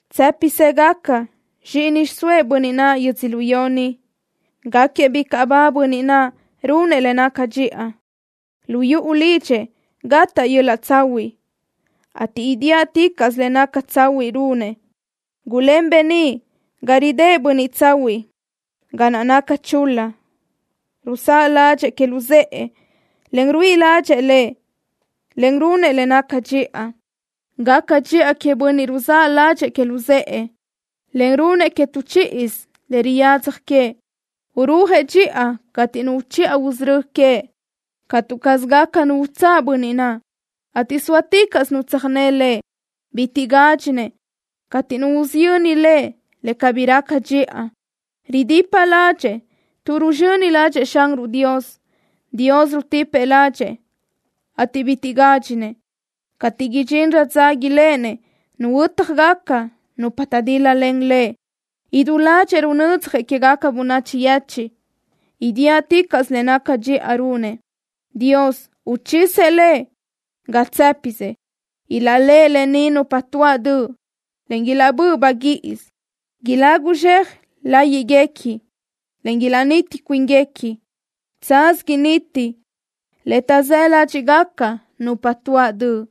Tsë́pisëgaca zxíʼini xiʼsóëʼ bönniʼ naʼ yödzölió ni. Gáquiëʼ bicaʼ ba bönniʼ naʼ runëʼ le naca dxiʼa. Lu yuʼu lidxëʼ gataʼ yöl-laʼ tsahuiʼ, ateʼ idíaʼticaʼsö le naca tsahuiʼ runëʼ. Gulén beníʼ ga ridë́ʼ bönniʼ tsahuiʼ ga naʼ naca chul-la. Ruzáʼ ládxëʼë que luzë́ʼë, en ruíʼi ládxëʼë lëʼ, en runëʼ le naca dxiʼa. Gaca dxiʼa queëʼ bönniʼ ruzáʼ ládxëʼë que luzë́ʼë, en runnëʼ que tu chíʼisö le riyadzaj que. Urúajëʼ dxiʼa cateʼ nu uchiʼa usörö́ queëʼ. Catu caz gaca nu utsáʼ bönniʼ naʼ, ateʼ sóaticaʼsö nu tsöjné lëʼ. Bitiʼ gádxinëʼ cateʼ nu usiyöni lëʼ le cabí raca dxiʼa. Ridipa ládxëʼë tuʼ ruzxöni ládxëʼë Xanruʼ Dios. Dios rutipëʼ ládxëʼë, ateʼ bitiʼ gádxinëʼ cateʼ idxinrö dza iléʼenëʼ nuhuö́tjagaca nupa taʼdíl-lalen lëʼ. Idú ládxëʼë runödzjëʼ quégaca bönachi yechiʼ. Idíaʼticaʼsö le naca dxiʼa runëʼ. Dios uchisëʼ lëʼ ga tsë́pisëʼ. Ilaʼléʼe lë ni nupa tuáʼ döʼ, en ilaʼbö́ʼ baguíʼisö. Ilagu zxe láyiʼgaca, en ilaʼniti cuínguequi. Tsaz initi le taʼzë́ ládxiʼgaca nupa tuáʼ döʼ.